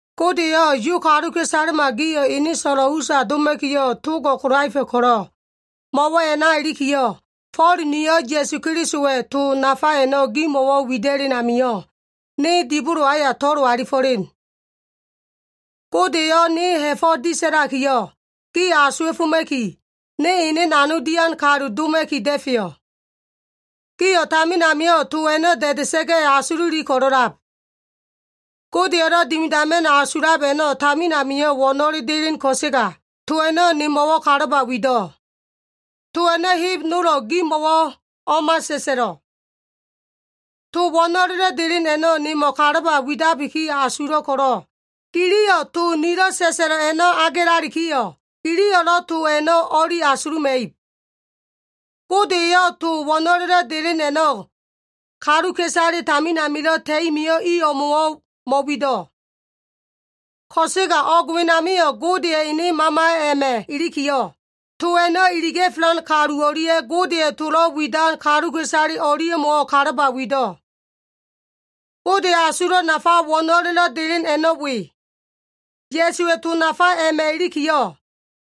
Gode eyo꞉ Yu kaluka꞉isalema gio꞉ ene so꞉lo꞉ usa doma꞉kiyo꞉, togo꞉ kolaefa꞉ ko꞉lo꞉, mo꞉wo꞉ a꞉na ilikiyo꞉, Fo꞉l niyo꞉ Ya꞉su Kelisowa꞉ to nafa a꞉no꞉ gimo꞉wo꞉ wida꞉len amio꞉, ne dibolo aya to꞉lo alifo꞉len. Gode eyo꞉ ne ha꞉fo꞉ disa꞉lakiyo꞉, gio꞉ asuwa꞉foma꞉ki, ne ene nanog dian kalu doma꞉ki da꞉feyo꞉. Gio꞉ tamin amio꞉ to a꞉no꞉ da꞉da꞉sa꞉ga꞉ asululi ko꞉lo꞉lab. Godeya꞉lo꞉ dimidama꞉no꞉ asulab a꞉no꞉ tamin amio꞉ wo꞉no꞉le delen ko꞉sega, to a꞉no꞉ nemo꞉wo꞉ kalaba wido꞉. To a꞉no꞉ heb nolo꞉ gimo꞉wo꞉ o꞉ma sa꞉sa꞉lo꞉. To wo꞉no꞉lelo꞉ delen a꞉no꞉ nemo꞉wo꞉ kalaba widabiki asulo꞉ ko꞉lo꞉, giliyo꞉ to nilo꞉ sa꞉sa꞉lo꞉ a꞉no꞉ agelalikiyo꞉, giliyo꞉lo꞉ to a꞉no꞉ o꞉li asuluma꞉ib. Gode eyo꞉ to wo꞉no꞉lelo꞉ delen a꞉no꞉ kaluka꞉isale tamin amilo꞉ ta꞉i mio꞉ i o꞉mo꞉wo꞉ mo꞉wido꞉. Ko꞉sega o꞉g wenamio꞉ Godeya꞉ ene Mama a꞉ma꞉ ilikiyo꞉, to a꞉no꞉ iliga꞉felan kalu o꞉lia꞉ Godeya꞉ tolo꞉ widan kaluka꞉isale o꞉lia꞉mo꞉wo꞉ kalaba wido꞉. Godeya꞉ asulo꞉ nafa wo꞉no꞉lelo꞉ delen a꞉no꞉ we. Ya꞉suwa꞉ to nafa a꞉ma꞉ ilikiyo꞉,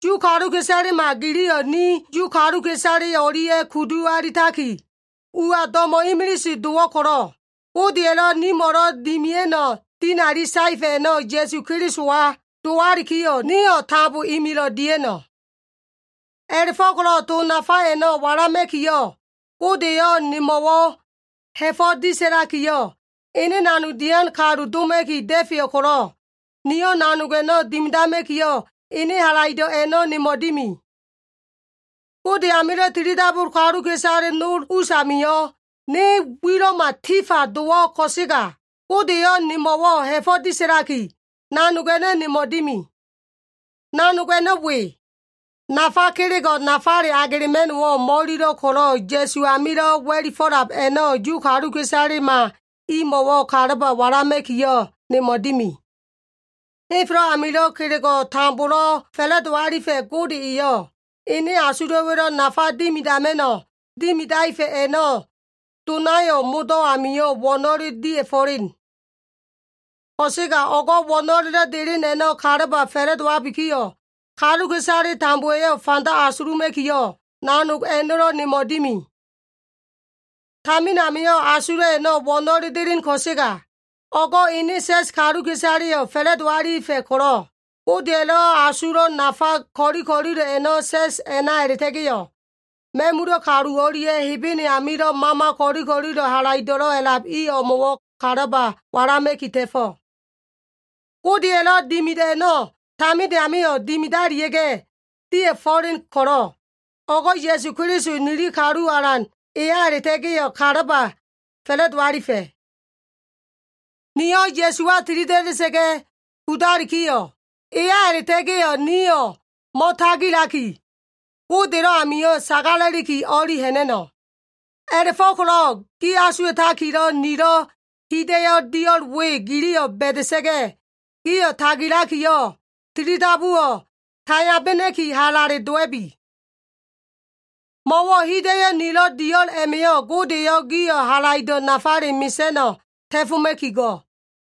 Yu kaluka꞉isalema giliyo꞉ ni Yu kaluka꞉isale o꞉lia꞉ kudu alitaki, uwa do꞉mo꞉ imilise dowo꞉ ko꞉lo꞉, Godeya꞉lo꞉ nimo꞉lo꞉ dimia꞉no꞉ dinali saefa꞉ a꞉no꞉ Ya꞉su Kelisowa dowalikiyo꞉ nio꞉ tambo imilo꞉ dia꞉no꞉. A꞉la꞉fo꞉ko꞉lo꞉ to nafa a꞉no꞉ walama꞉kiyo꞉, Gode eyo꞉ nemo꞉wo꞉ ha꞉fo꞉ disa꞉lakiyo꞉, ne ene nanog dian kalu doma꞉ki da꞉feyo꞉ ko꞉lo꞉, niyo꞉ nanog a꞉no꞉ dimidama꞉kiyo꞉, ene halaido꞉ a꞉no꞉ nemo꞉ dimi. Gode amilo꞉ tilidabu kaluka꞉isale nol us a꞉namio꞉, ne wilo꞉ma tifa dowo꞉ ko꞉sega, Gode eyo꞉ nemo꞉wo꞉ ha꞉fo꞉ disa꞉laki, nanog a꞉no꞉ nemo꞉ dimi. Nanog a꞉no꞉ we. Nafa kelego꞉ nafale agelema꞉no꞉wo꞉ mo꞉ililo꞉ ko꞉lo꞉ Ya꞉su amilo꞉ wa꞉lifo꞉lab a꞉no꞉ Yu kaluka꞉isalema imo꞉wo꞉ kalaba walama꞉kiyo꞉ nemo꞉ dimi. Henfelo꞉ amilo꞉ kelego꞉ tambolo꞉ fa꞉la꞉do alifa꞉ Gode eyo꞉, ene asulo꞉wa꞉lo꞉ nafa dimidama꞉no꞉ dimidaefa꞉ a꞉no꞉ donayo꞉ modo꞉ amio꞉ wo꞉no꞉le dia꞉fo꞉len. Ko꞉sega o꞉go꞉ wo꞉no꞉lelo꞉ delen a꞉no꞉ kalaba fa꞉la꞉dowabikiyo꞉, kaluka꞉isale tambowa꞉yo꞉ fanda asuluma꞉kiyo꞉, nanog a꞉no꞉lo꞉ nemo꞉ dimi. Tamin amio꞉ asulo꞉ a꞉no꞉ wo꞉no꞉le delen ko꞉sega, o꞉go꞉ ene sa꞉s kaluka꞉isaleyo꞉ fa꞉la꞉do alifa꞉ ko꞉lo꞉, Godeya꞉lo꞉ asulo꞉ nafa ko꞉li ko꞉lilo꞉ a꞉no꞉ sa꞉s a꞉na a꞉la꞉ta꞉ga꞉yo꞉, ma꞉mula꞉ kalu o꞉lia꞉ Hebene amilo꞉ mama ko꞉li ko꞉lilo꞉ halaido꞉lo꞉ a꞉lab i o꞉mo꞉wo꞉ kalaba walama꞉ki ta꞉fo꞉. Godeya꞉lo꞉ dimido꞉ a꞉no꞉ taminde amio꞉ dimidalia꞉ga꞉ dia꞉fo꞉len ko꞉lo꞉, o꞉go꞉ Ya꞉su Keliso nili kalu Alan eya a꞉la꞉ta꞉ga꞉yo꞉ kalaba fa꞉la꞉do alifa꞉. Nio꞉ Ya꞉suwa tilida꞉da꞉sa꞉ga꞉ kudalikiyo꞉, eya a꞉la꞉ta꞉ga꞉yo꞉ nio꞉ mo꞉tagilaki, Godelo꞉ amio꞉ sagala꞉liki o꞉li ha꞉na꞉no꞉. A꞉la꞉fo꞉ko꞉lo꞉ gi asuwa꞉takilo꞉ nilo꞉ hida꞉yo꞉ dio꞉l we giliyo꞉ ba꞉da꞉sa꞉ga꞉, gio꞉ tagilakiyo꞉ tilidabuwo꞉ taiyabena꞉ki halale dowa꞉bi. Mo꞉wo꞉ hida꞉yo꞉ nilo꞉ dio꞉l a꞉ma꞉yo꞉ Gode eyo꞉ gio꞉ halaido꞉ nafale mesa꞉no꞉ ta꞉foma꞉ki go꞉.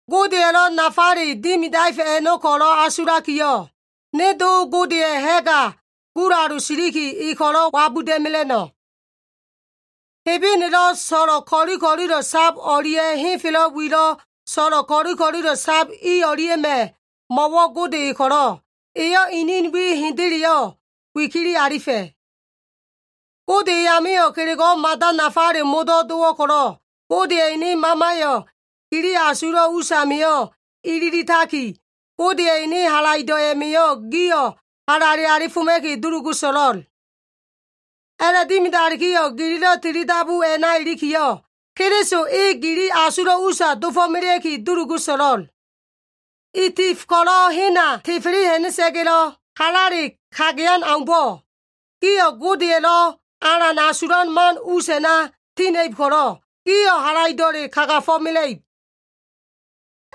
Godeya꞉lo꞉ nafale dimidaefa꞉ a꞉no꞉ ko꞉lo꞉ asulakiyo꞉, ne Do Godeya꞉ ha꞉ga gulalu siliki e ko꞉lo꞉ wabuda꞉mela꞉no꞉. Hebenelo꞉ so꞉lo꞉ ko꞉li ko꞉lilo꞉ sab o꞉lia꞉, henfelo꞉ wilo꞉ so꞉lo꞉ ko꞉li ko꞉lilo꞉ sab i o꞉lia꞉ma꞉, mo꞉wo꞉ Gode e ko꞉lo꞉, eyo꞉ inin wi hendeleyo꞉ wikili alifa꞉. Gode eyamio꞉ kelego꞉wo꞉ mada nafale modo꞉ dowo꞉ ko꞉lo꞉, Godeya꞉ ene Mamayo꞉ gili asulo꞉ usamio꞉ ililitaki, Godeya꞉ ene halaido꞉ a꞉ma꞉yo꞉ gio꞉ halale alifoma꞉ki dulugu so꞉lo꞉l. A꞉la꞉dimidalikiyo꞉ gililo꞉ tilidabu a꞉na ilikiyo꞉, Keliso e gili asulo꞉ usa dofo꞉melea꞉ki dulugu so꞉lo꞉l. I tef ko꞉lo꞉ hena tefele ha꞉na꞉sa꞉ga꞉lo꞉ halale kagayan aumbo꞉, gio꞉ Godeya꞉lo꞉ alan asulan man us a꞉na tina꞉ib ko꞉lo꞉, gio꞉ halaido꞉le kagafo꞉mela꞉ib.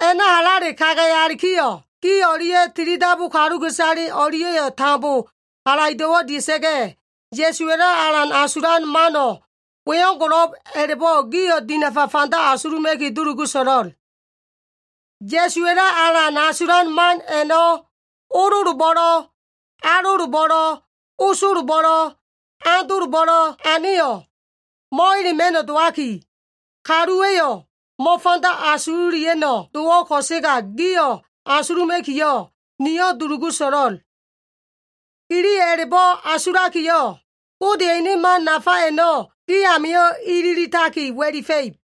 A꞉na halale kagayalikiyo꞉, gi o꞉lia꞉ tilidabu kaluka꞉isale o꞉lia꞉yo꞉ tambo halaido꞉wo꞉ dia꞉sa꞉ga꞉, Ya꞉suwa꞉lo꞉ alan asulan mano꞉ weo꞉ngo꞉lo꞉b a꞉la꞉bo꞉ gio꞉ dinafa fanda asuluma꞉ki dulugu so꞉lo꞉l. Ya꞉suwa꞉lo꞉ alan asulan man a꞉no꞉ ololobo꞉lo꞉, alolobo꞉lo꞉, osolobo꞉lo꞉, andolobo꞉lo꞉ aneyo꞉, mo꞉elema꞉no꞉ dowaki, kaluwa꞉yo꞉ mo꞉fanda asululia꞉no꞉ dowo꞉ ko꞉sega gio꞉ asuluma꞉kiyo꞉, niyo꞉ dulugu so꞉lo꞉l. Giliyo꞉ a꞉la꞉bo꞉ asulakiyo꞉, Godeya꞉ ene man nafa a꞉no꞉ gi amio꞉ ililitaki wa꞉lifa꞉ib.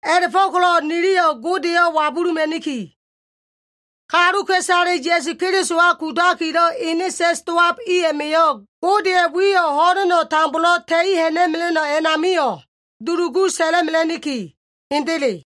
A꞉la꞉fo꞉ko꞉lo꞉ niliyo꞉ Godeyo꞉ wabuluma꞉niki. Kaluka꞉isale Ya꞉su Kelisowa kudakilo꞉ ene sa꞉s dowab i a꞉ma꞉yo꞉, Godeya꞉ wiyo꞉ ho꞉leno꞉ tambolo꞉ ta꞉i ha꞉na꞉mela꞉no꞉ a꞉namio꞉, dulugu sa꞉la꞉mela꞉niki. Hendele.